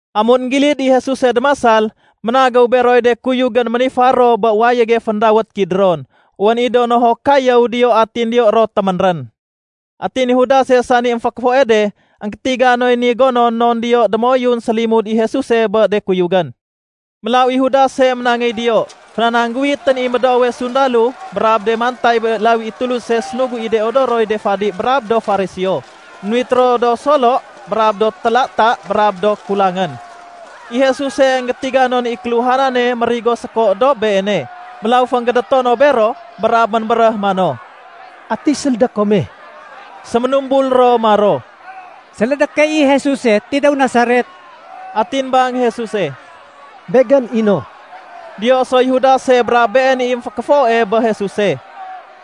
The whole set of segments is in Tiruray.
Amun énggilid i Jesuse démasal, ménagéw beroy de kuyugén ménifar ro bé wayége féndawét Kidron. Wén i do nohok kayéw diyo atin diyo ro téménrén. Atin i Judase sani émfékéfoe de énggétiga noy ni gonon non diyo démoyun sélimud i Jesuse bé de kuyugén. Mélaw i Judase ménangéy diyo, fénanangguwitén i médoowe sundalo brab de mantay bé lawi i Tuluse sénugu i de odoroy de fadi brab do Fariseo. Ménuwit ro do solo brab do téla-ta brab do kulangén. I Jesuse énggétiga non i kéluhanane mérigo séko dob Beene. Mélaw fénggédéto no bero brab ménbéréh mano, “Ati sélédé kome?” Séménumbul ro maro, “Sélédé key i Jesuse tidéw Nasaret.” Atin bang Jesuse, “Begén i no.” Diyo soy Judase brab been i émfékéfoe bé Jesuse.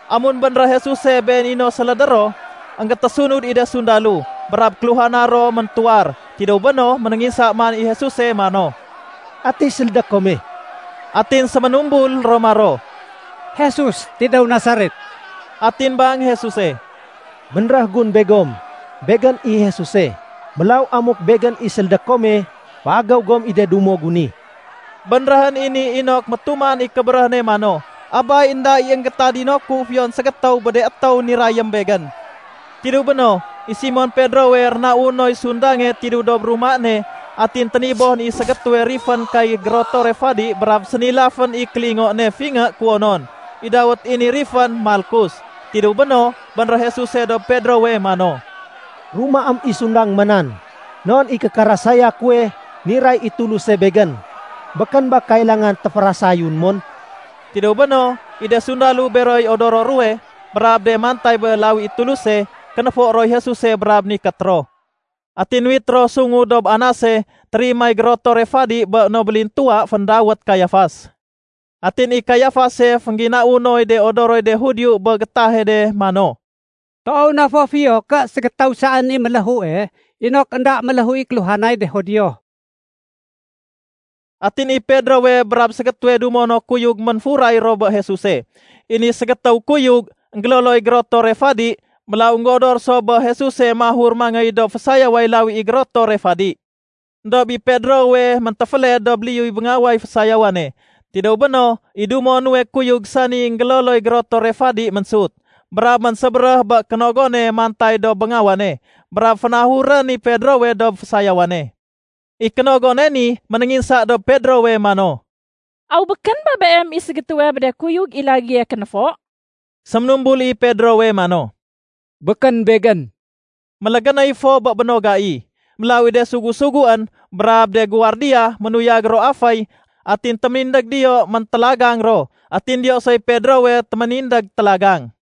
Amun bénréh Jesuse Been i no séléde ro, énggétésunud i de sundalo brab kéluhana ro méntuwar. Tidéw béno, ménénginsa man i Jesuse mano, “Ati sélédé kome?” Atin séménumbul ro maro, “Jesus tidéw Nasaret.” Atin bang Jesuse, “Bénréh gun begom, Begén i Jesuse. Mélaw amuk Begén i sélédé kome féagéw gom i de dumo gu ni.” Bénréhén i ni inok métuman i kébéréh ne mano, “Abay, énda i énggétadino ku fiyon ségétéw bé de étéw nirayém Begén.” Tidéw béno, i Simon Pedrowe rénau noy sundange tidéw dob ruma ne. Atin ténibohén i ségétéwe rifén kay gérotore fadi brab sénilafén i kélingo ne fingé kuwonon. I dawét i ni rifén Malkus. Tidéw béno, bénréh Jesuse dob Pedrowe mano, “Rumaém i sundang ma nan. Non i kékérasaya kuwe niray i Tuluse Begén, békén ba kailangan téférasayun mon?” Tidéw béno, i de sundalo beroy odoro ruwe, brab de mantay bé lawi i Tuluse, kénéfo roy Jesuse brab nikét ro. Atin nuwit ro sungu dob Anase, térimay gérotore fadi bé no bélintuwa féndawét Kayafas. Atin i Kayafase féngginau noy de odoroy de Judio bé gétahe de mano, “Toow na fo fiyo ké ségétéw saén i méléhue inok énda méléhu i kéluhanay de Judio.” Atin i Pedrowe brab ségétéwe dumo no kuyug ménfuray ro bé Jesuse. I ni ségétéw kuyug, énggéloloy gérotore fadi, mélaw énggéodor so bé Jesuse mahur mangéy dob fésayaway lawi i gérotore fadi. Endob i Pedrowe méntéféled dob liyuy béngaway fésayawane. Tidéw béno, i dumo nuwe kuyug sani énggéloloy gérotore fadi ménsut brab ménsébéréh bé kénogone mantay dob béngawane, brab fénahurén i Pedrowe dob fésayawane. I kénogone ni ménénginsa dob Pedrowe mano, “Aw békén ba beem i ségétéwe bé de kuyug i lagéye kénéfo?” Séménumbul i Pedrowe mano, “Békén begén.” Mélégénéy fo bé béno gai. Mélaw i de sugu-suguén brab de guwardiya ménuyag ro aféy atin téménindég diyo méntélagang ro. Atin diyo soy Pedrowe téménindég télagang.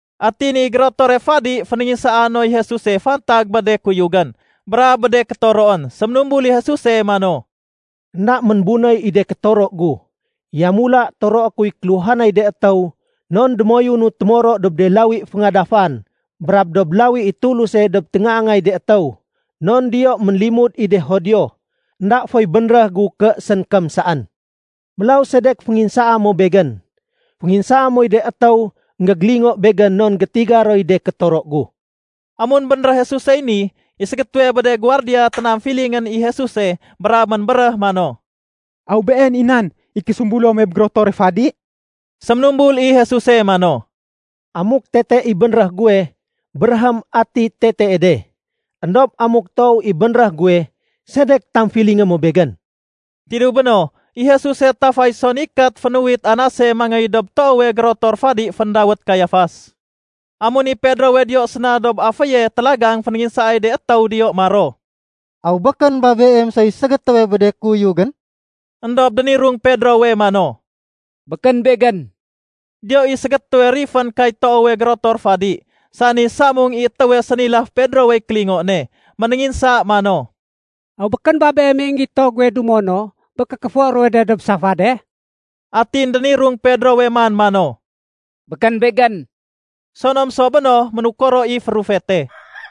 Atin i gérotore fadi fénénginsaa noy Jesuse fantag bé de kuyugén brab bé de kétoroén. Séménumbul i Jesuse mano, “Enda ménbunéy i de kétoro gu. Yamula toroé kuy kéluhanay de étéw non démoyunu témoro dob de lawi féngadafan brab dob lawi i Tuluse dob téngaangay de étéw, non diyo ménlimud i de Judio. Enda foy bénréh gu ké sénkém saén. Mélaw sedek fénginsaa mo Begén? Fénginsaa moy de étéw énggégélingo Begén non gétiga roy de kétoro gu.” Amun bénréh Jesusey ni, i ségétéwe bé de guwardiya ténamfilingén i Jesuse brab ménbéréh mano, “Aw been i nan i késumbulo muwe bé gérotore fadi?” Séménumbul i Jesuse mano, “Amuk tete i bénréh guwe, béréhém ati tetee de. Endob amuk toow i bénréh guwe, sedek tamfilingé mo Begén?” Tidéw béno, i Jesuse tafay so nikét fénuwit Anase mangéy dob toowe gérotor fadi féndawét Kayafas. Amun i Pedrowe diyo séna dob aféye télagang, fénénginsaay de étéw diyo maro, “Aw békén ba beem soy ségétéwe bé de kuyugén?” Endob dénirung Pedrowe mano, “Békén begén.” Diyo i ségétéwe rifén kay toowe gérotor fadi sani samung i étéwe sénilaf Pedrowey kélingo ne. Ménénginsa mano, “Aw békén ba beem i énggito guwe dumo no bé kékéfo ruwe de dob safade?” Atin dénirung Pedrowe man mano, “Békén begén.” Sonom so béno, ménukoro i férufete.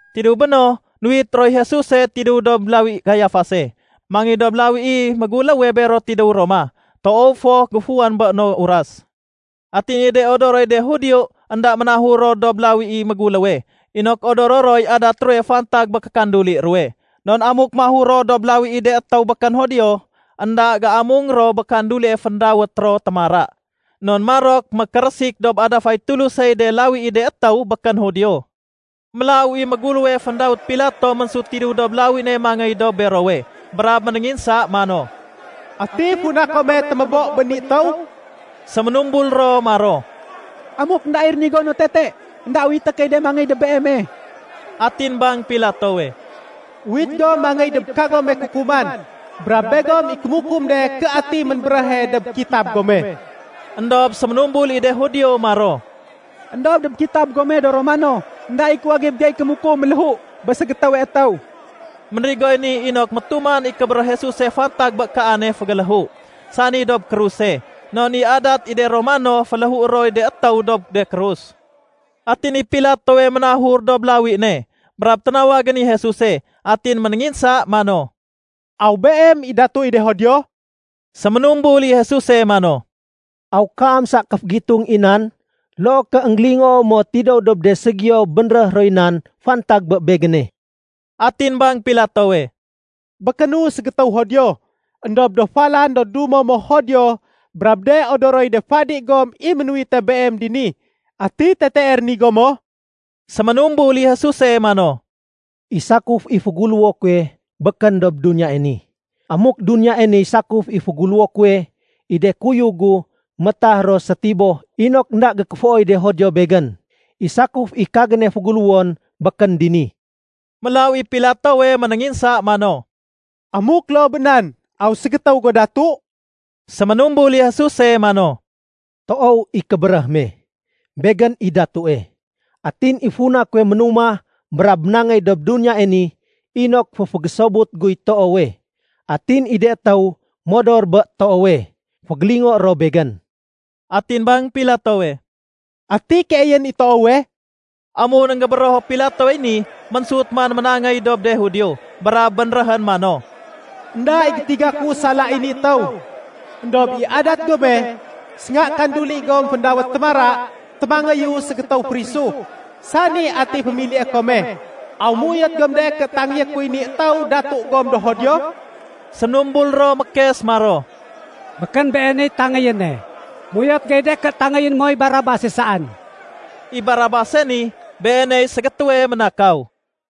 Tidéw béno, nuwit roy Jesuse tidéw dob lawi Kayafase mangéy dob lawi i méguléwe bero tidéw Roma. Toow fo géfuwén bé no uras. Atin i de odoroy de Judio énda ménahur ro dob lawi i méguléwe inok odoro roy adat ruwe fantag bé kékanduli ruwe. Non amuk mahur ro dob lawi i de étéw békén Judio, énda géamung ro bé kandulie féndawét ro “Témara” non marok mékérésik dob adafay Tulusey de lawi i de étéw békén Judio. Mélaw i méguléwe féndawét Pilato ménsut tidéw dob lawi ne mangéy dob berowe brab ménénginsa mano, “Ati funa kome témébo bé ni étéw?” Séménumbul ro maro, “Amuk énda i rénigo no tete, énda uwité key de mangéy dob beeme.” Atin bang Pilatowe, “Uwit gom mangéy dob kagome kukuman, brab begom i kémukum de ké ati ménbéréhe dob kitab gome.” Endob séménumbul i de Judio maro, “Endob dob kitab gome do Romano, énda i kuwagib gey kémukum méléhu bé ségétéwe étéw.” Ménrigoy ni inok métuman i kébéréh Jesuse fantag bé kaane fégéléhu, sani dob kruse. Non i adat i de Romano, féléhué roy de étéw dob de krus. Atin i Pilatowe ménahur dob lawi ne brab ténawagén i Jesuse, atin ménénginsa mano, “Aw Beem i datu i de Judio?” Séménumbul i Jesuse mano, “Aw kaam sa kéfegitung i nan loo ké énggélingoo mo tidéw dob de ségiyo bénréh roy nan fantag bé Begéne?” Atin bang Pilatowe, “Békénu ségétéw Judio! Endob do falan do dumo mo Judio brab de odoroy de fadi gom i ménuwite Beem dini. Ati tetee rénigo mo?” Séménumbul i Jesuse mano, “I sakuf i féguléwo kuwe békén dob duniyae ni. Amuk duniyae niy sakuf i féguléwo kuwe, i de kuyug gu métah ro sétiboh inok énda gékéfooy de Judio Begén. I sakuf i kagéne féguléwon békén dini.” Mélaw i Pilatowe ménénginsa mano, “Amuk loo bé nan, aw ségétéw go datu?” Séménumbul i Jesuse mano, “Toow i kébéréh me, Begén i datue. Atin i funa kuwe ménumah brab ménangéy dob duniyae ni inok féfégésobut guy toowe. Atin i de étéw modor bé toowe, fégélingoé ro Begén.” Atin bang Pilatowe, “Ati keeyén i toowe?” Amun énggébérého Pilatowey ni, ménsut man ménangéy dob de Judio brab bénréhén mano, “Enda i gétiga ku sala i ni étéw. Endob i adat gome, sénga kanduli gom féndawét ‘Témara,’ témangéyu ségétéw férisu, sani ati fémilié kome. Aw méuyot gom de ké tangéyé kuy ni étéw datu gom do Judio?” Séménumbul ro mékes maro, “Békén Been i tangéyéne. Méuyot gey de ké tangéyé moy Barabase saén.” (I Barabase ni, beeney ségétéwe ménakaw.)